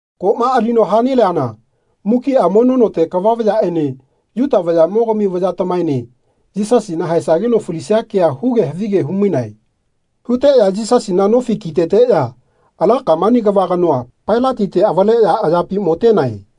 Koꞌma alino ha-neleana mukiꞌa mono note kava vayaꞌene Yuta vayaꞌmogami vayatamaene Yisasina haesageno falisia kea huge havige hu-mainae. Huteꞌya Yisasina nofi kiteteꞌya ala kamani kava kanoa, Pailatite, avaleꞌya ayapi motenae.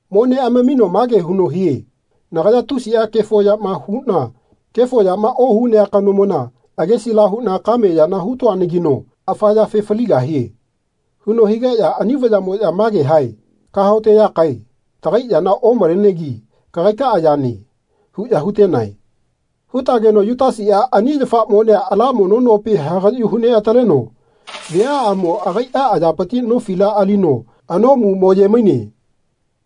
Mo neꞌamamino mage huno hie “Nagaya tusiꞌa kefo yama huꞌna kefo yama ohunea kanomona agesila huꞌna kame yana hu-toanagino afa yafe faligahie.” huno higeꞌya ani vayaꞌmoꞌya mage hae “Kahaote yakae. Tagai yana omalenegi kagaikaꞌa yane.” huꞌya hu-tenae. Hu-tageno Yutasiꞌa ani yafa monea ala mono nopi hagaꞌyu hu-neꞌataleno viaꞌamo agaiꞌa ayapiti nofila alino anoꞌmu mo-ye-maine.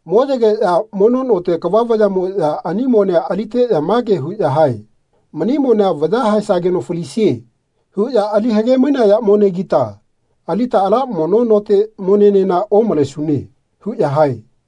Mo-yegeꞌya mono note kava vayaꞌmoꞌya ani monea aliteꞌya mage huꞌya hae “Mani monea ‘Vaya haesageno falisie.’ huꞌya ali hage-mainaya monegita alita ala mono note monenena omalesune.” huꞌya hae.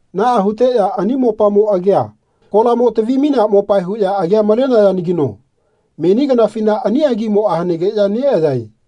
Naꞌa huteꞌya ani mopamo agia kolamo tavi-mainea mopae huꞌya agia malenayanagino meni kanafina ani agimoꞌa hanegeꞌya neꞌayae.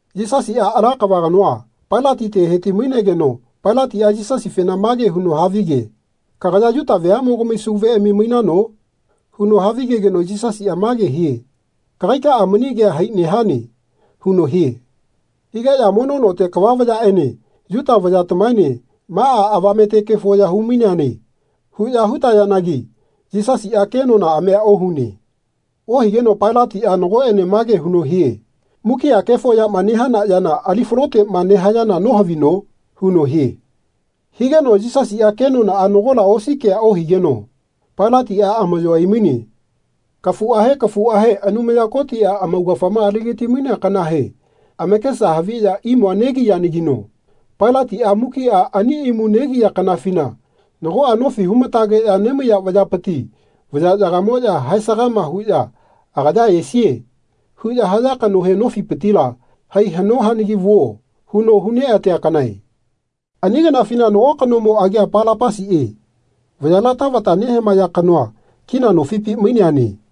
Yisasiꞌa ala kava kanoa, Pailatite, he-ti-mainegeno Pailatiꞌa Yisasifena mage huno havi-ge “Kagaya Yuta veaꞌmogami Sauveꞌami mainano?” huno havigegeno Yisasiꞌa mage hie “Kagaikaꞌa mani kea hai nehane.” huno hie. Higeꞌya mono note kava vayaꞌene Yuta vayatamaene “Maꞌa avamete kefo ya hu-maineane.” huꞌya hu-tayanagi Yisasiꞌa kenonaꞌamia ohune. Ohigeno Pailatiꞌa nagoꞌene mage huno hie “Mukiꞌa kefo yama nehana yana ali-faloteꞌma nehayana nohavino?” huno hie. Higeno Yisasiꞌa kenonaꞌa nagola osi kea ohigeno Pailatiꞌa amaꞌyo ai-maine. Kafuꞌahe kafuꞌahe Anumaya Kotiꞌa amaugafama ali-gati-mainea kanahe amakesa haviꞌya imua negiyanagino Pailatiꞌa mukiꞌa ani imu negia kanafina nagoꞌa nofi hu-matageꞌya nemaiya vayapiti vayaꞌyagamoꞌya haesagama huꞌya “Agaya esie.” huꞌya haya kanohe nofipitila “Hai haꞌno hanagi vuo.” huno hu-neꞌatea kanae. Ani kanafina nago kanomo agia Palapasiꞌe vayala tavata nehamaya kanoa kina nofipi maineane.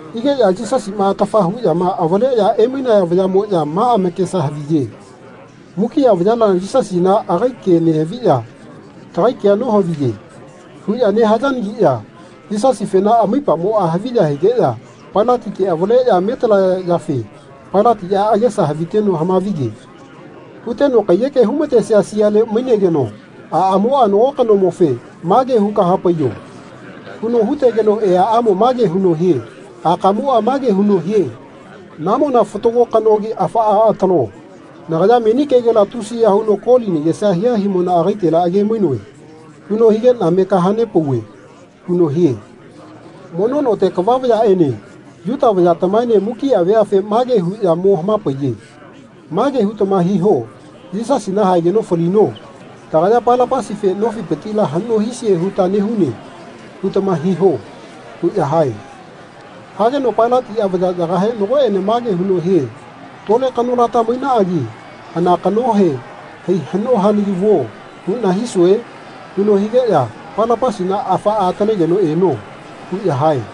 Higeꞌya Yisasima atafa huꞌyama avaleꞌya emainaya vayaꞌmoꞌya ma amakesa haviye “Mukiꞌa vayala Yisasina agai ke nehaviꞌya tagai kea nohaviye.” huꞌya nehayanagiꞌya Yisasifena amaipamoꞌa haviya higeꞌya Pailatite avaleꞌya metalaya yafe Pailatiꞌa agesa haviteno hama-vige. Huteno kaiyeke hu-ma-tesia siale mainegeno aꞌamoꞌa nago kanomofe “Mage huka hapaiyo.” huno hu-tegeno eaꞌamo mage huno hie “Akamoꞌa mage huno hie ‘Namona fatago kanogi afaꞌa atalo. Nagaya meni kegela tusiya huno koli nagesa hia himona agaitela age-mainoe.’ huno higeꞌna me kaha-nepauve.” huno hie. Mono note kava vayaꞌene Yuta vayatamaene mukiꞌa veafe mage huꞌya mo hama-paiye “Mage hutama hiho ‘Yisasina haegeno falino. Tagaya Palapasife nofipitila haꞌno hisie huta nehune.’ hutama hiho.” huꞌya hae. Hageno Pailatiꞌa vayaꞌyagahe nagoꞌene mage huno hie “Tole kanolata mainaꞌagi hana kanohe ‘Hai haꞌno hanagi vuo.’ huꞌna hisue?” huno higeꞌya “Palapasina afaꞌa atalegeno eno.” huꞌya hae.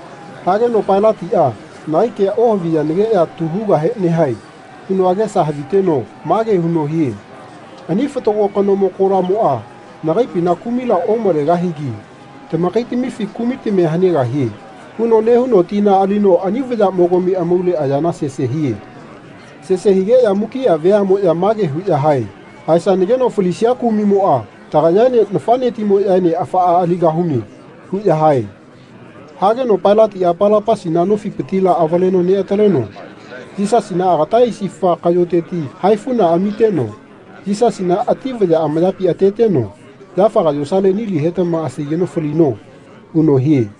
Hageno Pailatiꞌa “Nagai kea ohaviyanagiꞌya tu hugahe nehae.” huno agesa haviteno mage huno hie “Ani fatago kanomo kolamoꞌa nagaipina kumila omalegahigi tamakaitamifi kumitamia hanegahie.” huno nehuno tina alino ani vayaꞌmogami amaule ayana sese hie. Sese higeꞌya mukiꞌa veaꞌmoꞌya mage huꞌya hae “Haesanageno falisia kumiꞌmoꞌa tagayaene nafaꞌnetimoꞌyaene afaꞌa aligahune.” huꞌya hae. Hageno Pailatiꞌa Palapasina nofipitila avaleno neꞌataleno Yisasina agata aisifa kaꞌyoteti haifu amiteno Yisasina ati vaya amayapi ateteno “Yafaga yosale nili hetama asaigeno falino.” huno hie.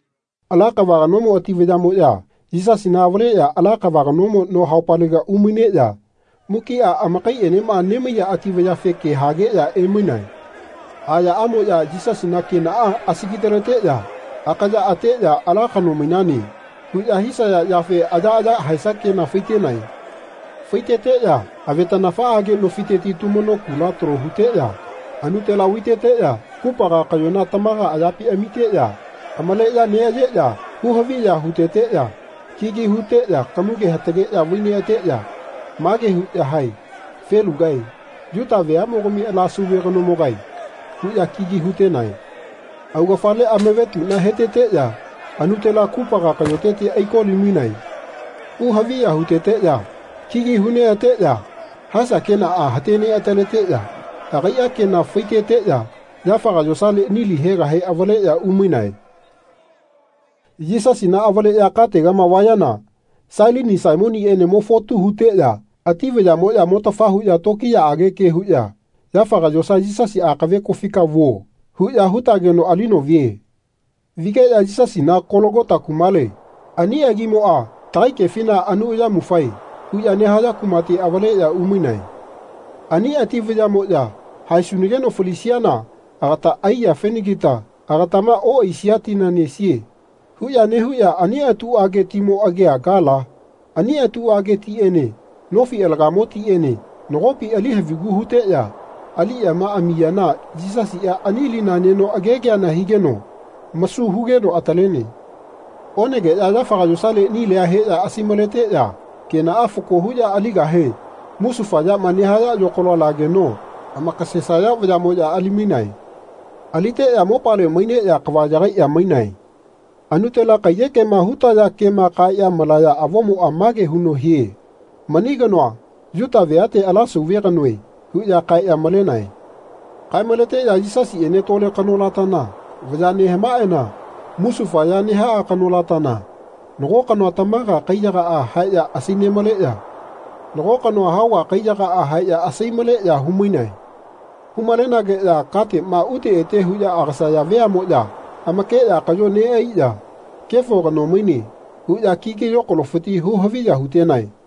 Ala kava kanomo ati vayaꞌmoꞌya Yisasina avaleꞌya ala kava kanomo no haupalega umaineꞌya mukiꞌa amakaiꞌenema nemaiya ati vayafe ke hageꞌya emainae. Ayaꞌamoꞌya Yisasina kenaꞌa asagi-taleteꞌya akaya ateꞌya “Ala kano mainane.” huꞌya hisaya yafe ayaꞌaya haesa kena fai-tenae. Fai-teteꞌya avetaꞌnafaꞌage nofiteti tumano kula talo huteꞌya anutela vai-teteꞌya kupaga kaꞌyona tamaga ayapi amiteꞌya amaleꞌya neꞌayeꞌya hu-haviya hu-teteꞌya kigi hu-teꞌya kamuge hatageꞌya vai-neꞌa-teꞌya mage huꞌya hae “Felugae. Yuta veaꞌmogami ala sauve kanomogae.” huꞌya kigi hu-tenae. Augafale amavetuꞌna he-teteꞌya anutela kupaga kaꞌyoteti aiko-li-mainae. Hu-haviya hu-teteꞌya kigi hu-neꞌa-teꞌya haesa kena hate neꞌa-taleteꞌya agaiꞌa kena fai-teteꞌya yafaga yosale nili hegahe avaleꞌya umainae. Yisasina avaleꞌya kategama vayana Sailini Saimoniꞌene mo-fotu huteꞌya ati vayaꞌmoꞌya motafa huꞌya tokiyaꞌage ke huꞌya “Yafaga yosa Yisasi akave kofika vuo.” huꞌya hu-tageno alino vie. Vigeꞌya Yisasina Kologota kumale, ani agimoꞌa tagai kefina anu ayamufae huꞌya nehaya kumate avaleꞌya umainae. Ani ati vayaꞌmoꞌya “Haesunageno falisiana agata ai yafenagita agatama oꞌaisia tina nesie.” huꞌya nehuꞌya ani atuꞌage timo agia gala. Ani atuꞌage tiꞌene nofi alagamo tiꞌene nagopi ali havigu huteꞌya aliꞌyama amiyana Yisasiꞌa ani lina neno agegeana higeno masu hugeno atalene. Onegeꞌya yafaga yosale nilia heꞌya asai-maleteꞌya kenaꞌa fako huꞌya aligahe musufa yama nehaya yokalo lageno amakasesaya vayaꞌmoꞌya ali-mainae. Aliteꞌya mopale maineꞌya kava yagaiꞌya mainae. Anutela kaiyekema hu-taya kema kaeꞌya malaya avomoꞌa mage huno hie “Mani kanoa Yuta veate ala Sauve kanoe.” huꞌya kaeꞌya malenae. Kae-maleteꞌya Yisasiꞌene tole kanolatana vaya nehamaeꞌana musufa ya nehaꞌa kanolatana nago kanoa tamaga kaiyagaꞌa haeꞌya asai-maleꞌya nago kanoa haoga kaiyagaꞌa haeꞌya asai-maleꞌya hu-mainae. Hu-malenageꞌya kateꞌma ute ete huꞌya agasaya veaꞌmoꞌya amakeꞌya kaꞌyo neꞌaiꞌya “Kefo kano maine.” huꞌya kigi yokalofiti hu-haviya hu-tenae.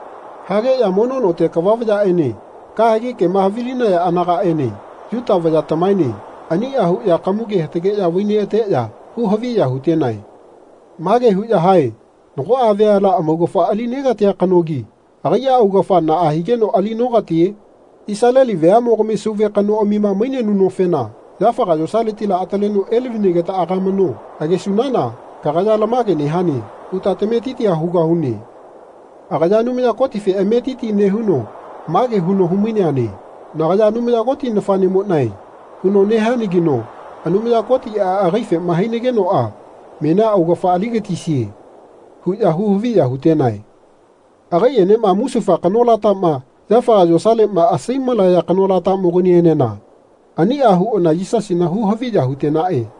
Hageꞌya mono note kava vayaꞌene kahegi kema havilinaya anagaꞌene Yuta vayatamaene aniꞌa huꞌya kamuge hatageꞌya vai-neꞌateꞌya hu-haviya hu-tenae. Mage huꞌya hae “Nagoꞌa veala amaugafa ali-negatia kanogi agaiꞌa augafa naꞌa higeno ali-nokatie? Isaleli veaꞌmogami Sauve kanoꞌamima mainenunofena yafaga yosaletila ataleno elavinageta agamano. Agesunana ‘Kagaya lamage nehane.’ huta tametitia hugahune. Agaya Anumaya Kotife ametiti nehuno mage huno hu-maineane ‘Nagaya Anumaya Koti nafaꞌnemoꞌnae.’ huno nehianagino Anumaya Kotiꞌa agaifema hainagenoꞌa menia augafa ali-gatisie.” huꞌya hu-haviya hu-tenae. Agaiꞌenema musufa kanolatama yafaga yosaleꞌma asai-malaya kanolatamoganienena aniꞌa huꞌana Yisasina hu-haviya hu-tenaꞌe.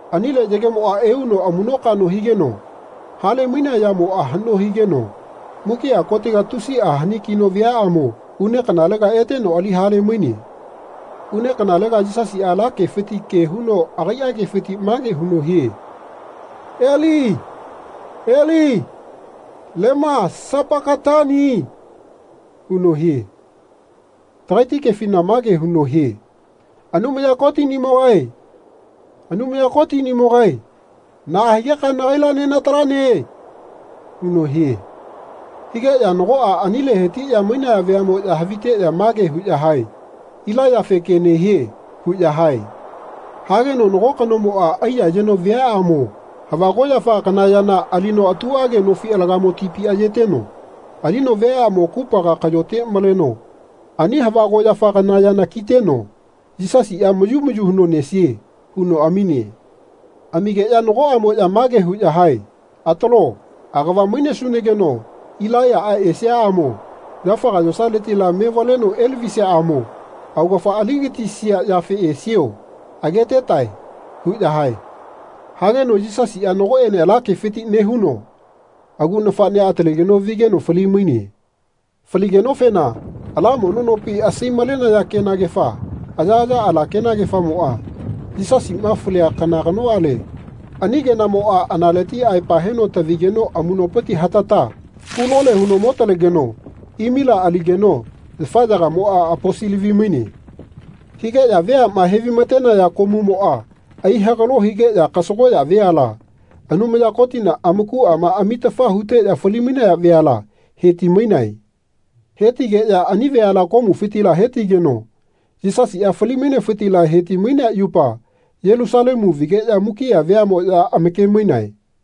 Anile yagemoꞌa euno amuꞌnokaꞌno higeno hale-mainea yamoꞌa haꞌno higeno mukiꞌa kotega tusiꞌa hani-kino viaꞌamo une kanalega eteno ali hale-maine. Une kanalega Yisasiꞌa ala kefiti ke huno agaiꞌa kefiti mage huno hie “Eli Eli lema sapakatani.” huno hie. Tagaiti kefina mage huno hie “Anumaya Kotiꞌnimogae Anumaya Kotiꞌnimogae naꞌa higeka nagaila nenatalane?” huno hie. Higeꞌya nagoꞌa anile heti-mainaya veaꞌmoꞌya haviteꞌya mage huꞌya hae “Ilaiyafe ke nehie.” huꞌya hae. Hageno nago kanomoꞌa aiya-yeno viaꞌamo hava koꞌyafa kana yana alino atuꞌage nofi alagamo tipi ayeteno alino viaꞌamo kupaga kaꞌyote maleno ani hava koꞌyafa kana yana kiteno “Yisasiꞌa mayu mayu huno nesie.” huno amine. Amigeꞌya nagoꞌamoꞌya mage huꞌya hae “Atalo, agava mainesunageno Ilaiyaꞌa esiaꞌamo yafaga yosaletila mevaleno elavisiaꞌamo augafama ali-gatisia yafe esio. Agetetae.” huꞌya hae. Hageno Yisasiꞌa nagoꞌene ala kefiti nehuno agu nafaꞌnea atalegeno vigeno fali-maine. Faligenofena ala mono nopi asai-malenaya kenagefa ayaꞌaya ala kenagefamoꞌa Yisasiꞌma falia kana kanoꞌale ani kenamoꞌa analeti aepa heno tavigeno amuꞌnopiti hatata hu-lole huno mo-talegeno imila aligeno yafaꞌyagamoꞌa aposi-lavi-maine. Higeꞌya veaꞌma he-vai-ma-tenaya komumoꞌa ai-hagalo higeꞌya kasagoꞌya veala, Anumaya Kotina amakuꞌama amitafa huteꞌya fali-mainaya veala, he-ti-mainae. He-tigeꞌya ani veala komufitila hetigeno Yisasiꞌa fali-mainefiti he-ti-mainea yupa Yelusalemu vageꞌya mukiꞌa veaꞌmoꞌya amake-mainae.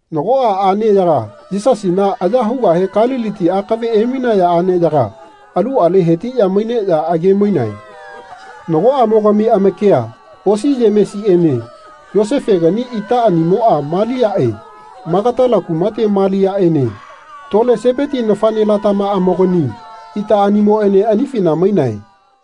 Nagoꞌa aꞌneyaga Yisasina aya hugahe Kaliliti akave emainaya aꞌneyaga aluꞌale hetiꞌya maineꞌya age-mainae. Nagoꞌamogami amakia osi Yemesiꞌene Yosefegani itaꞌanimoꞌa Maliaꞌe Magatala kumate Maliaꞌene tole Sepeti nafaꞌnelatamaꞌamogani itaꞌanimoꞌene anifina mainae.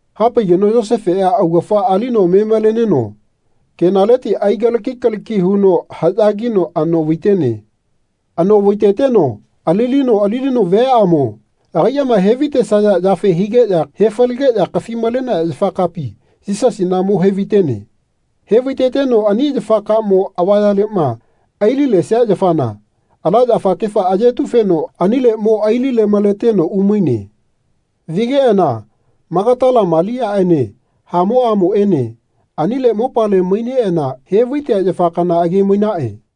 Hapaigeno Yosefeꞌa augafa alino me-maleneno kenaleti aigalaki kalaki huno haꞌya kino anoꞌvai-tene. Anoꞌvai-teteno alino alino viaꞌamo agaiꞌma he-vai-tesaya yafe higeꞌya he falegeꞌya kafi-malenaya yafakapi Yisasina mo he-vai-tene. He-vai-teteno ani yafa kamo avayaleꞌma ai-lilesia yafana, ala yafakefa ayetu-feno anile mo ai-lile-maleteno umaine. Vigeꞌana Magatala Maliaꞌene hamoꞌamoꞌene anile mopale maineꞌana he-vai-tea yafa kana age-mainaꞌe.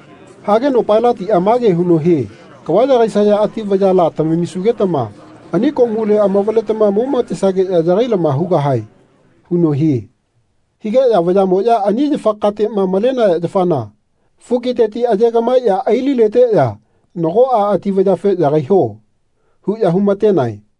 Hageno Pailatiꞌa mage huno hie “Kava yagaisaya ati vayala tamamisugetama ani komule amavaletama moma-tesageꞌya yagai-lama hugahae.” huno hie. Higeꞌya vayaꞌyamoꞌya ani yafa kateꞌma malenaya yafana fukiteti aye-gaꞌmaeꞌya ai-lileteꞌya nagoꞌa ati vayafe “Yagaiho.” huꞌya hu-ma-tenae.